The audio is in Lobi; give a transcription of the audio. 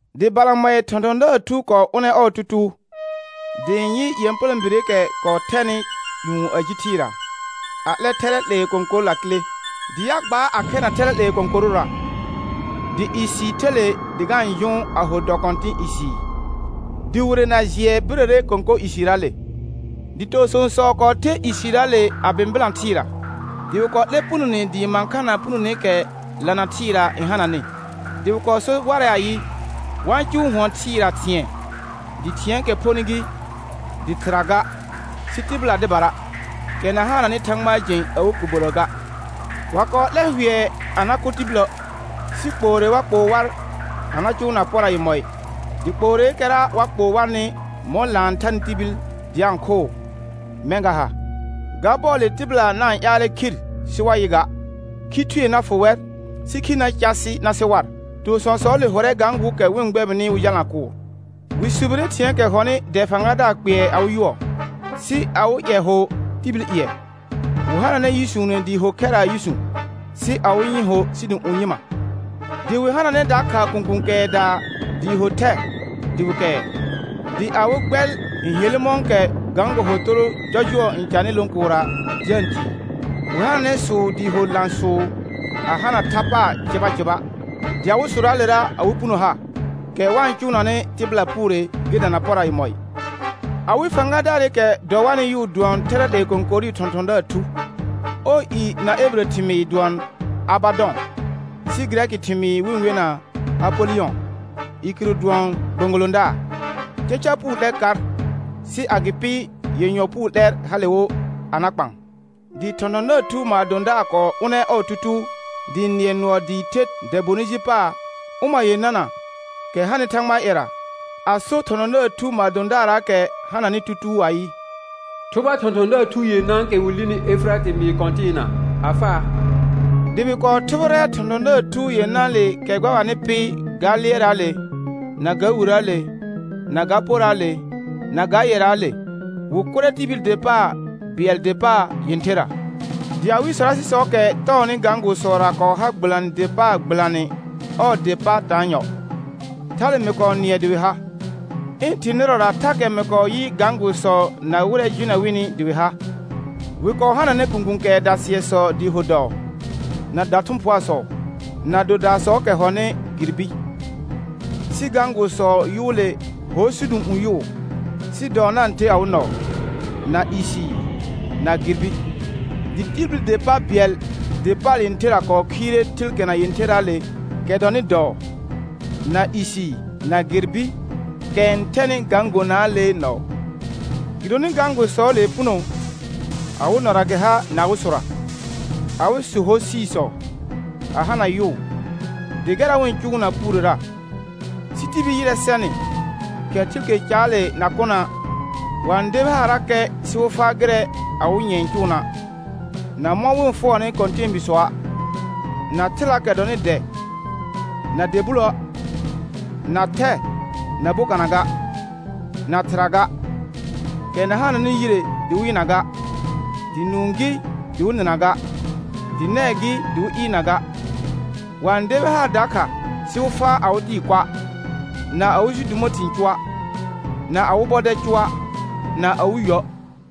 Dɩ balamɔɩ thɔ̃thɔ̃daar thu kɔɔ ʋnɛ ɔɔ tutuu, dɩ ɩ̃ yɩ ƴepələ̃bireekɛ kɔɔ thɛnɩ ƴũ a ji thɩɩra, a 'lɛ thɛrɛ 'lee kõkor lakile. Dɩ a gbaar a khɛrna thɛrɛ 'lee kõkorʋra, dɩ isiir the le dɩ ga-n jʋʋn a ho dɔ kɔ̃tɩ̃ isiir, dɩ wire na jɩɛ birəre kõkor isiirraale. Dɩ toosõosɔ kɔɔ ther isiirraale a bɩ̃bɩlã thɩɩra, dɩ wɩ kɔɔ 'lɛr punone dɩɩ mãkhana punoneekɛ lana thɩɩra n hananɩ. Dɩ wɩ kɔɔ so warɛ ayɩ, wa-n cʋʋ hʋɔn thɩɩra thɩ̃ɛ, dɩ thɩ̃ɛɛkɛ phonɩ gɩ, dɩ thɩra ga, sɩ tɩbɩla dɩbara, kɛ na hananɩ Thãgbaa jẽ awɩ kobirə ga. Wa kɔɔ 'lɛ hʋɛ a na kʋ tibilə', sɩ kpoore wa kpoo war a na cʋʋna pora yemɔɩ; dɩ kpooreekɛra wa kpoo warnɩ mɔ̃ laan n thanɩ tibil dɩ a-n khʋʋ, mɛ̃ ga ha. Ga bɔɔle tɩbɩla na-n ƴaalɛ khir sɩ wa yɩ ga; khi thue na fʋ wɛr, sɩ khir na car sɩ na sɩ war. Toosõosɔɔle hʋrɛ gãgʋʋsɔɔkɛ wɩ-n gbɛbɩnɩ wɩ jalna kʋʋr. Wɩ subire thɩ̃ɛɛkɛ hɔnɩ dɛ fãgadaar kpɩɛr awɩ yʋɔ, sɩ awɩ ƴɛ ho tibil ƴɩɛ. Wɩ hananɛ yʋsuune dɩɩ ho khɛraa yʋsũ, sɩ awɩ nyɩ̃ ho sidũ'ũ nyɩma. Dɩ wɩ hananɛ dakha kũkũ kɛɛdaa dɩɩ ho thɛ dɩ wɩ kɛɛ, dɩ awɩ gbɛl n helle mɔ̃kɛ gãgo hotoro jɔjʋɔ n canɩ lõ kʋʋrra dɩ a-n tii. Wɩ hananɛ sʋʋ dɩɩ ho lã sʋʋ a hana tha paar cɩba cɩba, dɩ awɩ sʋraalera awɩ puno ha, kɛ wa-n cʋʋnanɩ tɩbɩla puure gɩ dana pora yemɔɩ. Awɩ fãgadaarɩkɛ dɔ warnɩ yʋʋ dʋɔn thɛrɛ 'lee kõkorʋʋ thɔ̃thɔ̃daar thu. Ɔɔ i na ebirə thɩmɩɩr n dʋɔn Abadɔ̃, sɩ gɩrɛkɩ thɩmɩɩr wɩ-n wena Apolɩyɔ̃; i kɩrʋ dʋɔn gbõgolõdaar. Caca puu 'lɛr kar, sɩ agɩpɩ yenyɔ puu 'lɛr hale wo a na kpaan. Dɩ thɔ̃thɔ̃daar thu maadõdaar kɔɔ ʋnɛ ɔɔ tutuu, dɩ ɩ̃ nɩɛ nʋɔ dɩɩ the dɛ bonɩ ji paar ʋma yenana, kɛ hanɩ Thãgbaa ƴɛra, a so thɔ̃thɔ̃daar thu maadõdaarraakɛ hananɩ tutuu ayɩ: Thʋba thɔ̃thɔ̃daar thu yenãakɛ wɩ lini Efɩratɩ mɩɩr kɔ̃tɩɩna a faa. Dɩ wɩ kɔɔ thʋbɩrɛ thɔ̃thɔ̃daar thu yenãale kɛ gbɛbanɩ pɩ ga lɩɛrraale, na ga wirəəle, na ga poraale, na ga yɛraale, wɩ kʋrɛ tibil der pa bɩɛl der paar yẽtherra. Dɩ awɩ sɔrasɩsɔɔkɛ tɔɔnɩ gãgʋʋsɔra kɔɔ har gbɩlanɩ der paar gbɩlanɩ ɔɔ der pa taanyɔ. Thale mɩ kɔɔ nɩɛ dɩ wɩ ha. Ɩ̃ thɩ̃ nɩrɔra thakɛ mɩ kɔɔ yɩ gãgʋʋsɔ na wɩrɛ jʋnɛ wɩnɩ dɩ wɩ ha: Wɩ kɔɔ hananɛ kũkũ kɛɛda sɩɛsɔ dɩɩ ho dɔɔ, na dathʋ̃phʋaasɔ, na dodaasɔɔkɛ hɔnɩ girbi. Sɩ gãgʋʋsɔɔ yʋʋle hor sidũ'ũ yʋʋ, sɩ dɔɔ na-n the awɩ nɔɔ, na isiir, na girbi. Dɩ tibil der pa bɩɛl der paar yẽtherra kɔɔ khiire thɩlkena yẽtherraale kɛ dɔnɩ dɔɔ, na isiir, na girbi, kɛ n thɛnɩ gãgonaalee nɔɔ. Gɩdonɩ gãgʋʋsɔɔlee puno, awɩ nɔra gɩ ha na awɩ sʋra. Awɩ sʋ hor siisɔ, a hana yʋʋ, dɩ gɛrra wɩ-n cʋʋna puurera. Sɩ tibil ƴɩrɛ sɛnɩ, kɛ thɩlke caale na kʋna', wa-n debi haarrakɛ sɩ wɩ faa gɩrɛ awɩ nyɛ̃ n cʋʋna', na mɔ̃ wɩ-n fʋɔrnɩ kɔ̃tɛɛbiisɔa', na thɩlaakɛ dɔnɩ dɛ na dɛ buloə', na thɛ na bokana ga, na thɩra ga, kɛ na hananɩ yire dɩ wɩ yɩna ga, dɩ nũu gɩ dɩ wɩ nɩna ga, dɩ nɛɛ gɩ dɩ wɩ ɩɩrna ga. Wa-n debi haar dakha sɩ wɩ faa awɩ tɩɩ kʋa', na awɩ sidumo thɩ̃ cʋa', na awɩ bɔdɛl cʋa', na awɩ yuə'.